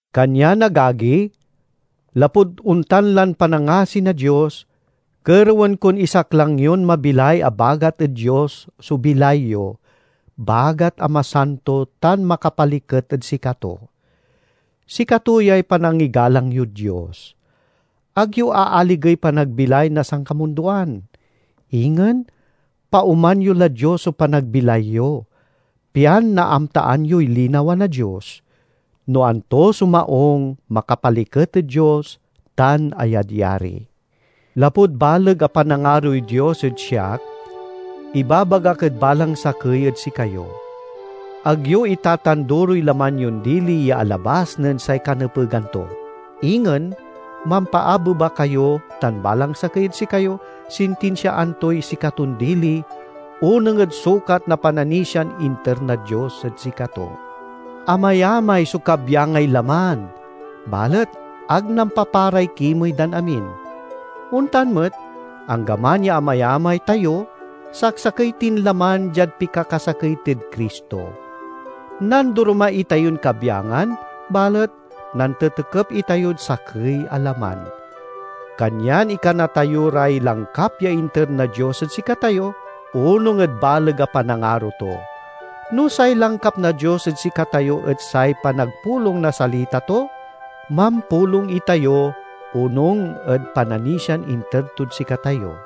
Kanyan, agagi, lapud ontan lan panangasi na Dios, kerewen kon isaklang yon mabilay a bagat ed Dios so bilay yo, bagat a masanto tan makapaliket ed sikato. Sikato yay panangigalang yod Dios. Ag yo aaligey panagbilay na sankamundoan. Ingen paoman yo lad Dios so panagbilay yo, pian naamtaan yoy linawa na Dios—no anto so maung, makapaliket ed Dios, tan ayadyari. Lapud baleg a panangaroy Dios ed siak ibabagak ed balang sakey ed sikayo: Ag yo itatanduroy laman yon dili ya alabas nen say kanepegan to. Ingen mampaabeba kayo tan balang sakey ed sikayo sintinsiaan toy sikaton dili, onung ed sukat na pananisian inter na Dios ed sikato. Amayamay so kabyangay laman, balet ag nampaparay kimey dan amin. Ontan met, anggaman ya amayamay tayo, saksakey tin laman diad pikakasakey tid Cristo. Nandoroma itayon kabyangan, balet nantetekep itayod sakey a laman. Kanyan ikana tayo ray langkap ya inter na Dios ed sikatayo, onung ed baleg a panangaro to. No say langkap na Dios ed sikatayo et say panagpulong na salita to, mampulong itayo, onung ed pananisian inter tod sikatayo;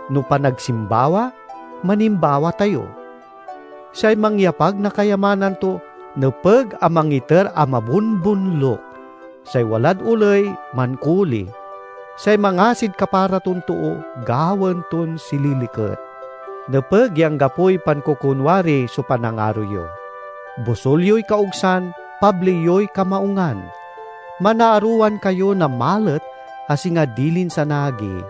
no panagsimbawa, manimbawa tayo. Say mangyapag na kayamanan to, nepeg a mangiter a mabonbonluk; say walad oley, mankoli; say mangasid kapara ton too, gawaen ton sililiket. Nepeg ya anggapoy pankokonwari so panangaro yo. Bosul yoy kaogsan, pabli yoy kamaungan. Manaarowan kayo na malet, a singa dilin sanaagi;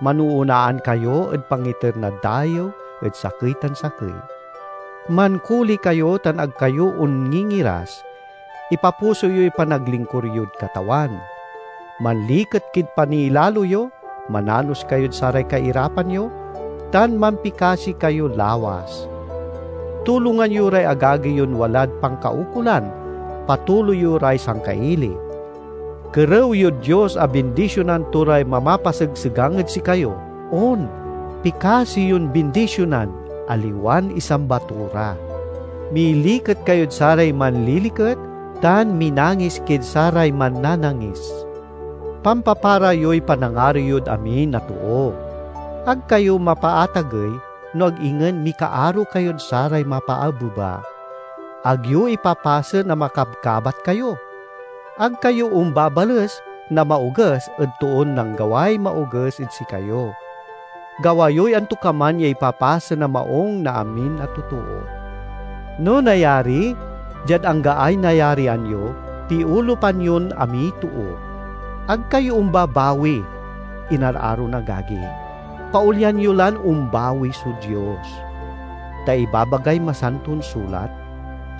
manoonaan kayo ed pangiter na dayew ed sakey tan sakey. Mankoli kayo tan ag kayo onngingiras. Ipapuso yoy panaglingkur yod Katawan. Manliket kid paniilalo yo, mananos kayod saray kairapan yo, tan mampikasi kayo lawas. Tulongan yo ray agagi yon walad pankaukolan, patuloy yo ray sangkaili. Kerew yod Dios a bindisionan to ray mamapasegsegang ed sikayo; on, pikasi yon bindisionan, aliwan isamba to ra. Miliket kayod saray manliliket, tan minangis kid saray mannanangis. Pampapara yoy panangaro yod amin a too. Ag kayo mapaatagey, no ag ingen mikaaro kayod saray mapaabeba. Ag yo ipapasen a makabkabat kayo. Ag kayo ombabales na maoges ed toon nanggaway maoges ed sikayo. Gawa yoy antokaman ya ipapasen a maung na amin a totoo. No nayari, diad anggaay nayarian yo, piolupan yon amiy too. Ag kayo ombabawi, inararon agagi; paolyan yo lan ombawi so Dios. Ta ibabagay Masanton Sulat,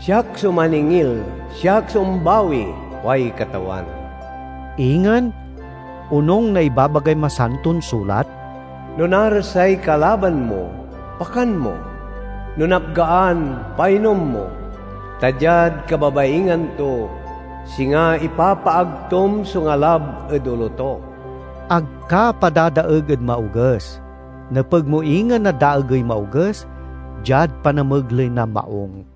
"Siak so maningil, siak so ombawi, kuay Katawan." Ingen, onung na ibabagay Masanton Sulat, "No narasay kalaban mo, pakan mo; no napgaan, painom mo; ta diad kababaingan to, singa ipapaagtom so ngalab ed olo to." Ag ka padadaeg ed maoges; nepeg mo ingen a daegey maoges diad panamegley na maung.